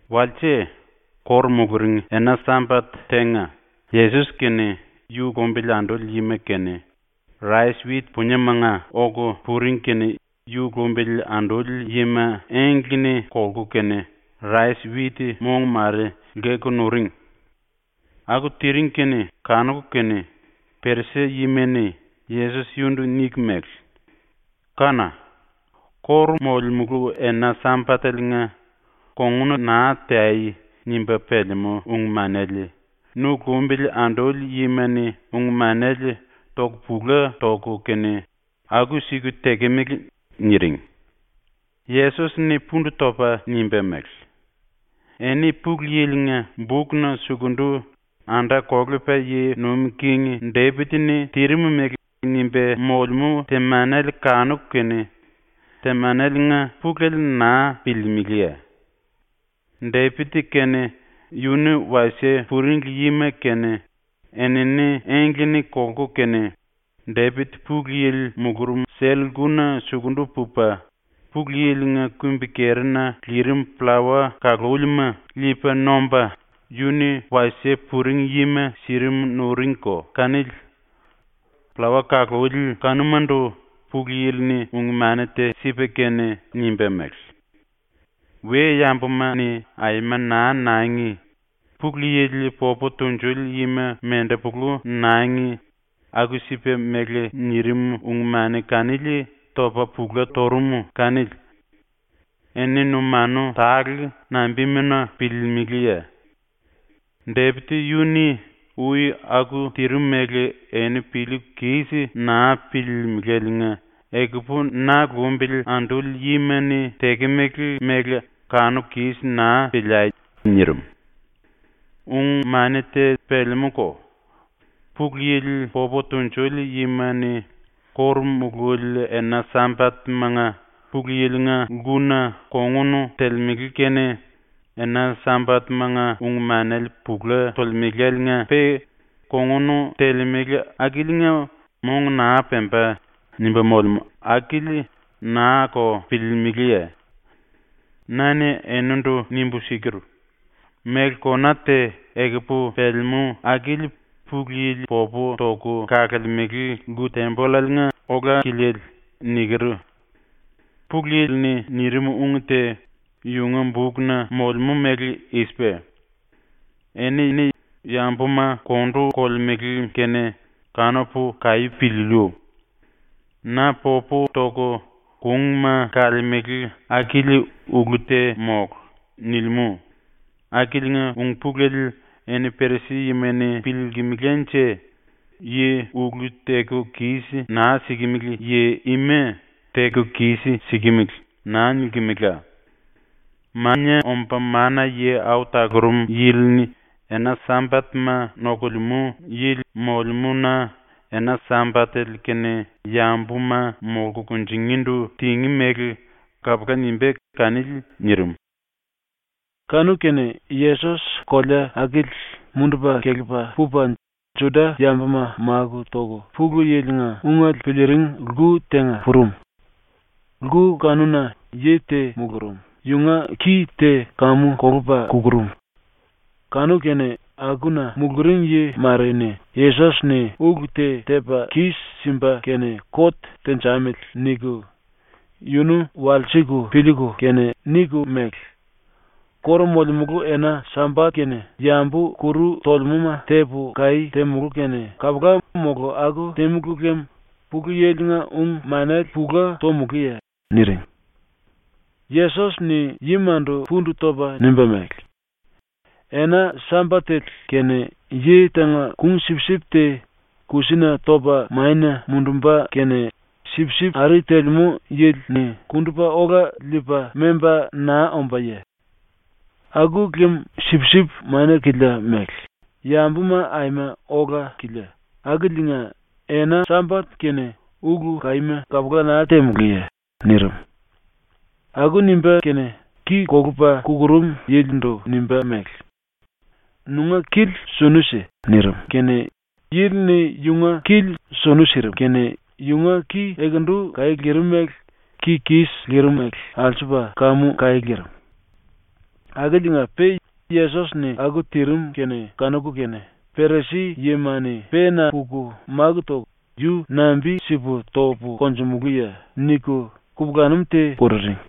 Walse, ⸤kóru muluring⸥ ena Sambat tenga, Yesos kene yu lumbili anduli yima kene rais-wit puniemanga oku puring kene yu lumbili anduli yima engle-ni kolku kene rais-wit mong mare lkeku nuring. Aku tiring kene kanuku kene Perisi-yima-ni Yesos yunundu niku mele: “Kána! ⸤Kóru molemulu⸥ ena Sambateliinga ‘Kongun naa teangi.’ nimba pelemú ung-manele nu lumbili anduli yima-ni ung-manele toku pula toku kene aku-siku tekemele.” niring. Yesos-ni pundu topa nimba mele: “Eni Pulu Yili-nga bukna sukundu ⸤anda-kolepa yi nuim king⸥ Depit-ni tirim mele nimba molemú temanele kanuku kene temaneliinga pulele naa piliilimiliye? Depit kene yunu wasie puring yima kene enini engle-ni kolku kene, Depit Pulu Yili mulurum sell-lkuna sukundu pupa, Pulu Yili-nga kumbi-kerina lirim pllawa kalúlima liipa nomba, yunu wasie puring yima sirim nuringko kanili. Pllawa-kaluli kanumandu Pulu Yili-ni ung-mani te sipa kene nimba mele: “We-yambuma-ni aima naa nangi! Pulu Yili popu tunjuli yima mendepulu nangi!” aku-sipa mele nirim ⸤ung-mani kanili topa pula turum⸥ kanili. ⸤Eni numanu tale nambimuna piliilimiliye? Depit yunu-ni ui aku tirim mele eni piliiku kis naa piliilimiléliinga ekupu na lumbili anduli yima-ni tekemele mele kanuku kis naa piliai.⸥” ⸤nirim.⸥ “Ung-mani te pelemúko. “Pulu Yili popu tunjuli yima-ni ⸤kóru mululi⸥ ena Sambat-manga Pulu Yili-nga lkuna kongun telemele kene ena Sambat-manga ung-manele pula tolemelaliinga-pe kongun telemele akiliinga mong naa pemba.” nimba molemú akili naa-ko piliilimiliye? Na-ni enindu nimbu siker: “Méle kona te ekupu pelemú akili Pulu Yili popu toku kalemele lku-tembollaliinga ola-kiliele.” niker. ⸤Pulu Yili-ni nirim ung te yunga bukna molemú mele i-sipa:⸥ “Eni yambuma kondu kolemele kene kanupu kaí piliiliu. Na popu toku kungma kalemele akili ulu te mólu.” nilimú, akiliinga ung-pulele eni Perisi-yima-ni piliilkimilánje yi ulu teku kis naa sikimili yi ima “Teku kis-sikimili.” naa nilkimela. Mania Omba Mana-Yi Au Talurum Yili-ni ena Sambatma nokulemú yili molemú-na ⸤ena Sambatele-kene yambuma molku kunjingíndu tingí mele kapula nimbá kanili⸥.” nirim. Kanu-kene Yesos kolea akili mundupa kelepa pupa Juda-yambuma máku toku Pulu Yili-nga ungele piliiring lku tenga purum. Lku kanuna yi te mulurum, yunga ki te kamu kolupa kukurum. Kanu-kene akuna muluring yi mare-ni ‘Yesos-ni ulu te tepa kis-simba kene kot tenjamili.’ niku yunu walsiku piliiku kene niku mele: “Kóru molemulu ena Sambat-kene yambu kuru tolemúma tepu kaí temulú kene kapula mola aku tímulu lem Pulu Yili-nga ung-manele pula tomulúye?” niring. Yesos-ni yimandu pundu topa nimba mele: “Ena Sambatele-kene yi tenga kung-sipsip te kusina topa mania mundumba kene sipsip ari telemú yili-ni kundupa ola liipa memba naa ombáye? Aku lem sipsip mania-kilia mele, yambuma aima ola-kilia, akiliinga, ena Sambat-kene ulu kaíma kapula naa temulúye?” nirim. Aku nimba kene ki kolupa kukurum yilindu nimba mele: “Nunga kili sunu si.” nirim kene yili-ni yunga kili sunu sirim kene yunga ki ekendu kaí lirim mele ki kis lirimele alsupa kamu kaí lirim. Akiliinga-pe ⸤Yesos-ni aku tirim kene kanuku kene⸥ Perisi-yima-ni pena puku máku toku “Yu nambi-sipu topu konjumulúye?” niku kupulanum te kururing.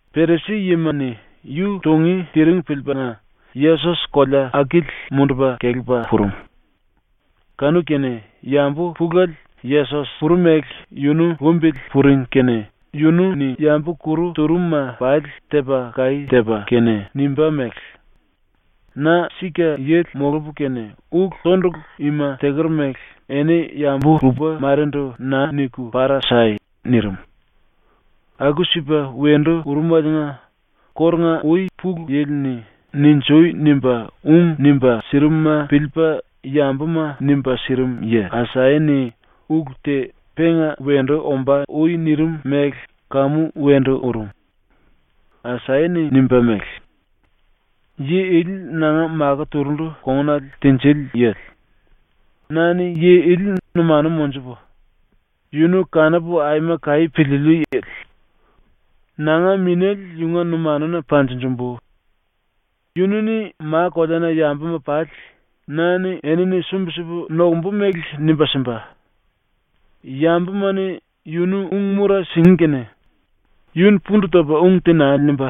⸤Perisi-yima-ni⸥ yu tungí tiring piliipaliinga Yesos kolea akili mundupa kelepa purum. Kanu-kene yambu pulele Yesos purum mele yunu lumbili puring kene yunu-ni yambu kuru turum-ma pali tepa kaí tepa kene nimba mele: “Na sika yili molupu kene ulu-tondulu ima teker mele eni yambu lupa marendu naa niku para sai!” nirim. Aku-sipa wendu urumeliinga kórunga-ui Pulu Yili-ni “Ninjui!” nimba ung nimba sirimuma piliipa yambuma nimba sirim yi Asaya-ni ulu te penga wendu ombá ui nirim mele kamu wendu urum. Asaya-ni nimba mele: “Yi ili nanga makó turundu kongunale tinjili yili; na-ni yi ili numanu monjupu, yunu kanupu aima kaí piliiliu yili. Nanga Minéle yunga numanuna panjinjimbu. Yunu-ni ma-koleana yambuma pali na-ni enini sumbi-sipu nokumbu mele nimba simba. Yambuma-ni yunu ung-mura singí kene yu-ni pundu topa ung te naa nimba,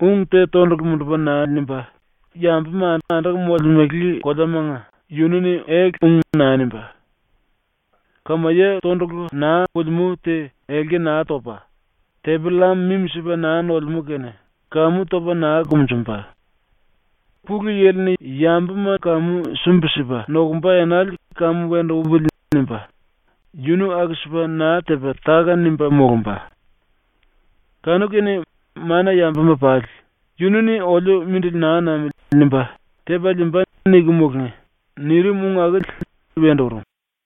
ung te tondulu mundupa naa nimba, yambuma anduku molemele koleamanga yunu-ni ele-ung naa nimbá. Kamaye tondulu naa pulimú te elki naa topa, tepi-llam mimi-sipa naa nolemú kene kamu topa naa kumunjumba. ‘Pulu Yili-ni yambuma kamu sumbi-sipa nokumba enale kamu wendu upili.’ nimba yunu aku-sipa naa tepa táka-nimba molumba. Kanu-kene mana-yambuma pali ‘Yunu-ni ‘oliu mindili naa namili.’ nimba tepa liimba.’ niku mulungí.” nirim ung akili wendu urum.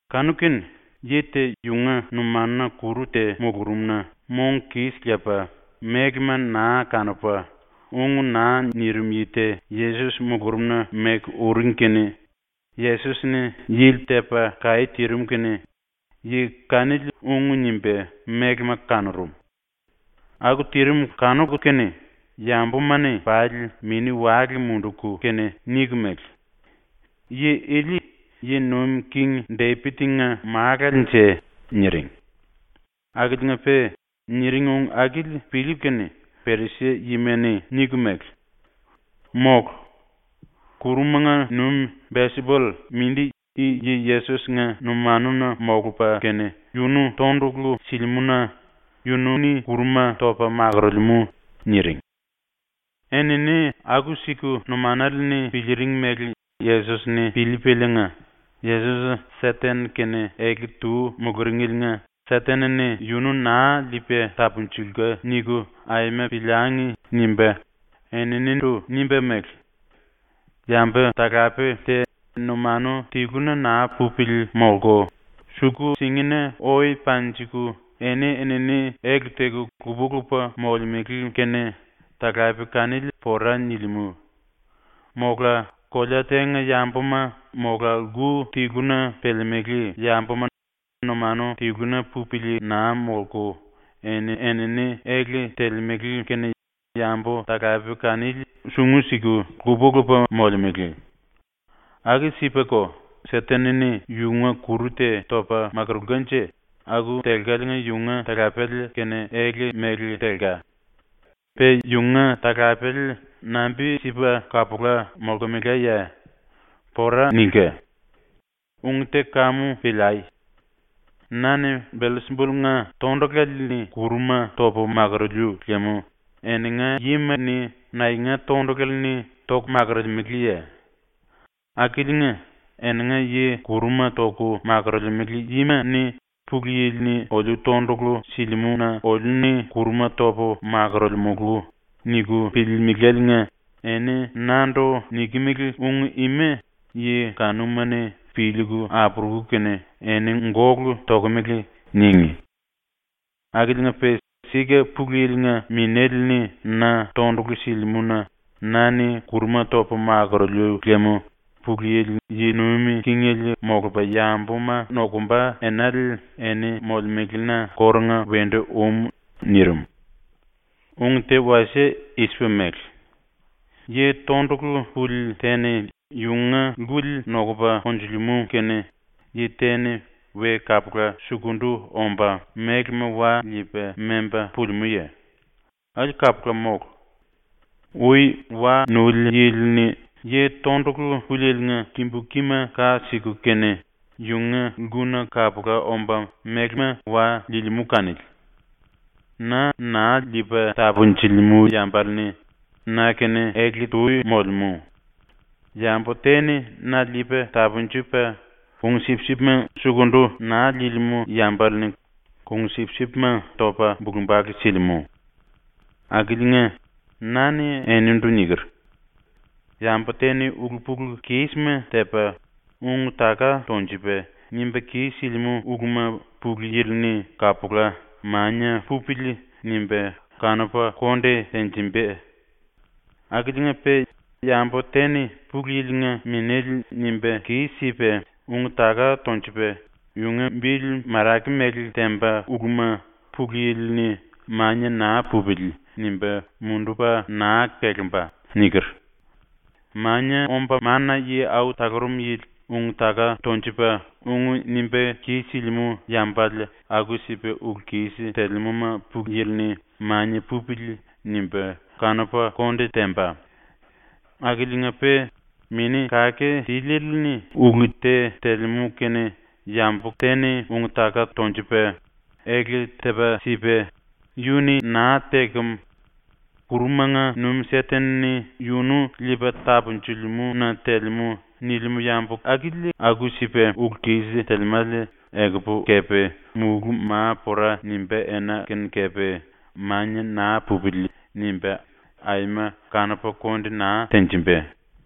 Kanu-kene yi te yunga numanuna kuru te mulurum-na mong kis lepa mélema naa kanupa ung naa nirim yi te Yesos mulurumna meku uring kene Yesos-ni yili tepa kaí tirim kene yi kanili ung nimba mélema kanurum. Aku tirim kanuku kene yambuma-ni pali mini-wale munduku kene niku mele: “Yi ili ⸤yi nuim king⸥ Depit-nga Málalenje?” niring. Akiliinga-pe niring ung akili piliiku kene Perisi-yima-ni niku mele: “Mólu. Kurumanga nuim Belsipull mindi i yi ⸤Yesos-⸥nga numanuna molupa kene yunu tondulu silimú-na yunu-ni kuruma topa makorolemú.” niring. Enini aku-siku numanale-ni piliiring mele Yesos-ni piliipaliinga ⸤‘Yesos ‘Seten-kene ele-tu muluringeliinga Seten-ni yunu naa liipa tapunjulka.’ niku aima piliangi.’ nimba⸥ eninindu nimba mele: “Yambu-talape te numanu tiluna naa pupili molku suku-singina oe panjiku eni-enini ele teku lupa-lupa molemele kene talape kanili pora nilimú. ⸤Mola⸥ kolea tenga yambuma mola lku tiluna pelemelé yambuma numanu tiluna pupili naa molku eni-enini ele telemele kene yambu-talape kanili sungu siku lupa-lupa molemele. Aku-sipako, Seten-ni yunga kuru te topa makurulkanje aku telkaliinga yunga talapele kene ele mele telka. Pe yunga talapele nambi-sipa kapula molkemelaye? ⸤Pora nilka.⸥ “Ung te kamu piliai. Na-ni Belsipull-nga tondulale-ni kuruma topu makuruliu lem eninga yima-ni naenga tondulale-ni kuruma toku makurulemeleye? Akiliinga, ⸤eninga yi kuruma toku makorolemele yima-ni ‘Pulu Yili-ni oliu tondulu silimú-na oliu-ni kuruma topu makorolemulu.’ niku piliilimiléliinga⸥ eni nandu nikimili ung ima yi kanuma-ni piliiku apuruku kene “Eni gólu tokomele.” ningí. Akiliinga-pe sika Pulu Yili-nga Minéle-ni na tondulu silimú-na na-ni kuruma topu makuruliu lem Pulu Yili yi nuim kingele molupa yambuma nokumba enale eni molemelena kórunga wendu um.” ⸤nirim.⸥ “Ung te wasie i-sipa mele: Yi tondulu puli te-ni yunga lkuli nokupa konjulimú kene yi te-ni we kapula sukundu omba mélema wa liipa memba pulimúye? Akili kapula mólu. Ui wa nuli yili-ni yi tondulu pulieliinga kimbu kima ka siku kene yunga lkuna kapula omba mélema wa liilimú kanili. “Na naa liipa tapunjilimú yambale-ni na-kene ele-tu molemú. Yambu te-ni na liipa tapunjupa ⸤kung-sipsipma⸥ sukundu naa liilimú yambale-ni ⸤kung-sipsipma⸥ topa bulu-bale silimú. Akiliinga, na-ni enindu niker: “Yambu te-ni ulu-pulu-kísima tepa, ung-taka tonjupa nimba kis-silimú uluma Pulu Yili-ni kapula ‘Mania pupili.’ nimba kanupa konde tenjimba. Akiliinga-pe yambu te-ni Pulu Yili-nga Minéle nimba kis-sipa ung-taka tonjupa yunga bili marake mele temba uluma Pulu Yili-ni ‘Mania naa pupili.’ nimba mundupa naa kelemba.” niker. Mania Omba Mana-Yi Au Talurum Yili ung-taka tonjupa ung nimba kis-silimú yambale aku-sipa ulu-kis telemúma Pulu Yili-ni ‘Mania pupili.’ nimba kanupa konde temba. Akiliinga-pe Mini Kake Tiliele⸤-ni ulu te telemú kene⸥ yambu te-ni ung-taka tonjupa, ele tepa sipa ⸤“Yunu-ni naa tekem. Kurumanga nuim Seten-ni yunu liipa tapunjilimú-na telemú.⸥” nilimú yambu akili aku-sipa ulu-kis telemále ekupu kepe mulú ma pora nimbá ena kene kepe ‘Mania naa pupili.’ nimba aima kanupa konde naa tenjimba.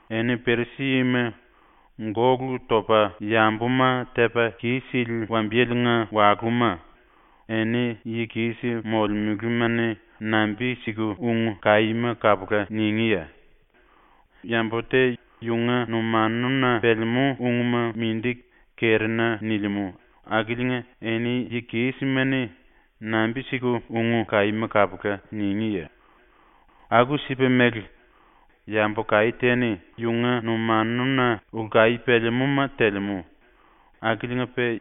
Eni Perisi-yima, gólu topa yambuma tepa kis-sili wambiyelenga walúma, eni yi kis molemelema-ni nambi-siku ung kaíma kapula ningíye? Yambu te yunga numanuna pelemú ungma mindi kerina nilimú akiliinga eni yi kísima-ni nambi-siku ung kaíma kapula ningíye? Aku-sipa mele, yambu kaí te-ni yunga numanuna ulu kaí pelemúma telemú, akiliinga-pe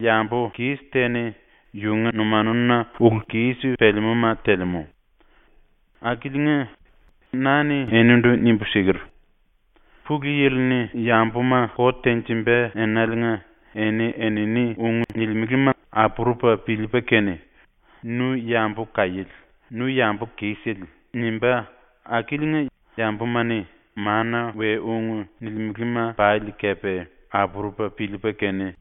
yambu kis te-ni yunga numanuna ulu-kis pelemúma telemú. “Akiliinga na-ni enindu nimbu siker: “Pulu Yili-ni yambuma kot tenjimba enaliinga eni-enini ung nilimelema apurupa piliipa kene “Nu yambu kaiéle, nu yambu kisele.” nimbá akiliinga yambuma-ni mana-we-ung nilimelema pali kepe apurupa piliipa kene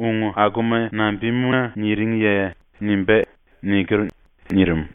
“Ung akuma nambimuna niringiye?” nimbá.” niker.” nirim.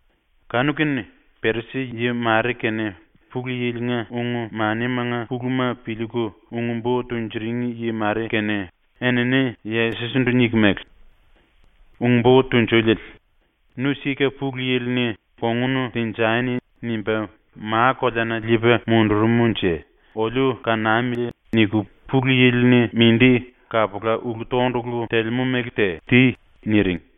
Kanu-kene Perisi-yi mare kene Pulu Yili-nga ung-manimanga puluma piliiku ung-bo tunjuring yi mare kene enini Yesos-ndu niku mele: “Ung-Bo Tunjuliele, ‘Nu sika Pulu Yili-ni “Kongun tenjani.” nimba ma-koleana liipa mundurumnje oliu kanamili.’ niku Pulu Yili-ni mindi kapula ulu-tondulu telemú mele te ti.” niring.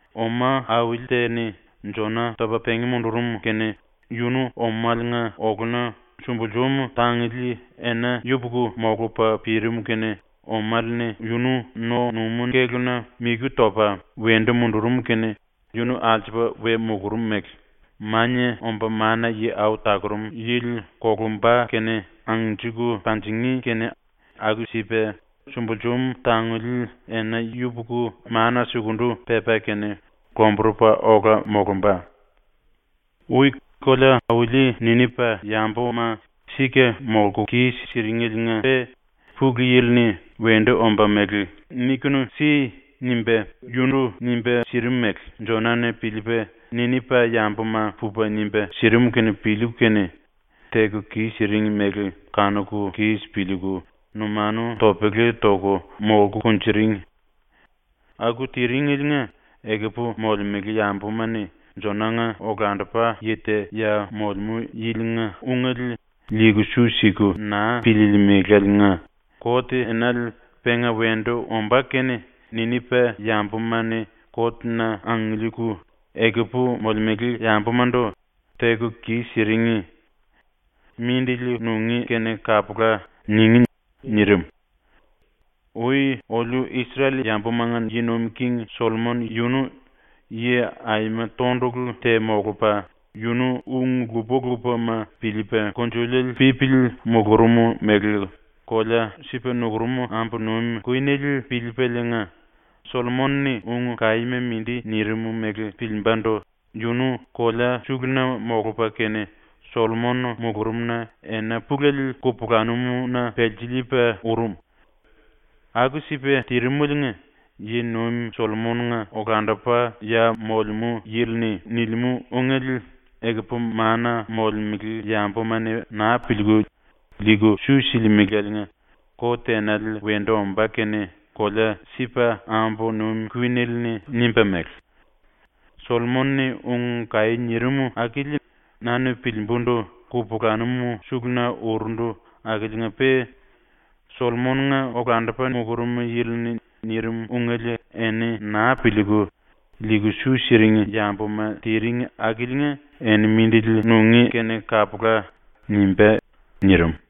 Oma auli te-ni Jona topa pengí mundurum kene yunu omaliinga oluna sumbulsum tanguli ena yupuku molupa pirim ⸤kene omale-ni yunu no-numú kéluna miku topa wendu mundurum kene yunu alsupa we mulurum⸥ mele Mania Omba Mana-Yi Au Talurum Yili ⸤kolumba kene angnjiku panjingí kene⸥ aku-sipa sumbulsum tanguli ena yupuku mana sukundu pepa kene ⸤lomburupa ola molumba⸥. “Ui kolea-auli Ninipa-yambuma ⸤sika molku kis-siringeliinga-pe Pulu Yili-ni wendu ombá mele “Nikunu si.” nimba yundu nimba sirim mele⸥ Jona-ni ⸤piliipa⸥ Ninipa-yambuma pupa nimba sirim kene piliiku kene teku kis-siring mele kanuku kis piliiku numanu topele toku molku kunjuring. Aku tiringeliinga ekupu molemele yambuma-ni Jona-nga olandupa yi te ya molemú yilinga ungele liiku su siku naa piliilimiléliinga kot-enale penga wendu ombá kene Ninipa-yambuma-ni kot-na angiliiku, ekupu molemele yambumandu “Teku kis-siring. Mindili nungí kene kapula.” ningí.” ⸤nirim.⸥ “Ui oliu Isrel-yambumanga yi nuim king Sollomon yunu yi aima tondulu te molupa, yunu ung lupa-lupama piliipa kungnjuliele pípili mulurum mele kolea Sipa nukurum ambu nuim kuinele piliipaliinga, Sollomon-ni ung kaíma mindi nirim mele piliimbandu yunu kolea suluna molupa kene ⸤Sollomon mulurumna⸥ ena pulele kupulanum-na pelsiliipa urum. Aku-sipa tirimeliinga, yi-nuim Sollomon-nga olandupa ya molemú yili-ni nilimú ungele ekupu mana molemele yambuma-ni naa piliiku, liiku su silimeláliinga kot-enale wendu ombá kene kolea Sipa ambu nuim kuinele-ni nimba mele: “Sollomon-ni ung kaí nirim akili na-ni piliimbundu kupulanum suluna urundu akiliinga-pe Sollomon-nga olandupa mulurum yili-ni nirim ungele eni naa piliiku, liiku su siring yambuma tiring akiliinga eni mindili nungí kene kapula.” nimbá.” ⸤nirim.⸥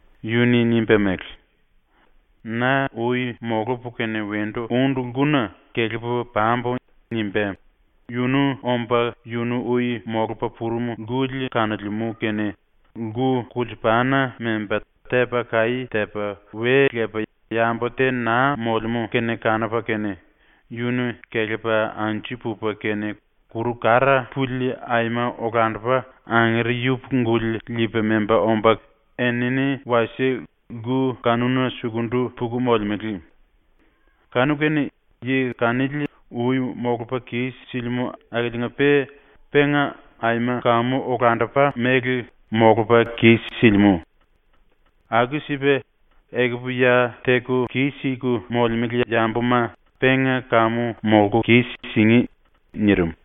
yunu-ni nimba mele: “Na ui molupu kene wendu úndu lkuna kelepu pambu.” nimba yunu omba yunu ui molupa purum lkuli kanolemú kene lku kulsupana memba tepa kaí tepa we lepa yambu te naa molemú kene kanupa kene, yunu kelepa anju pupa kene kuru kara puli aima olandupa angere yupuku-guli liipa memba omba enini wasie lku kanuna sukundu puku molemele. Kanu-kene yi kanili ui molupa kis-silimú akiliinga-pe penga aima kamu olandupa mele molupa kis-silimú. Aku-sipa, ekupu ya teku kis-siku molemele yambuma penga kamu molku kis-singí.” nirim.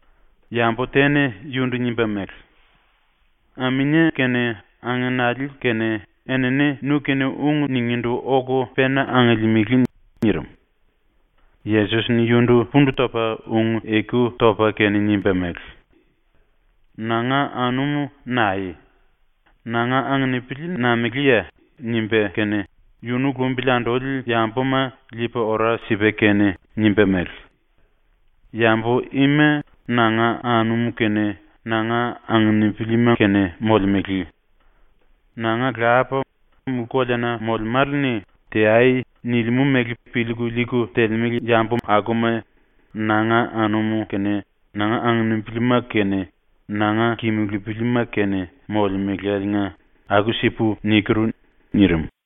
Yambu te-ni yundu nimba mele: “Aminie kene angenali kene enini nu-kene ung ningíndu oku pena angiliimili.” nirim. Yesos-ni yundu pundu topa ⸤ung-eku topa kene⸥ nimba mele: “Nanga anum naeye? Nanga anginipili nameléye?” nimba kene, yunu lumbili anduli yambuma liipa ora sipa kene nimba mele: “Yambu ima nanga anum kene nanga anginipilima kene molemele. Nanga Lapa, mulú-koleana molemále-ni “Teai.” nilimú mele piliiku liiku telemele yambuma nanga anum kene nanga anginipilima kene nanga kimulupilima kene molemeláliinga aku-sipu niker.” nirim.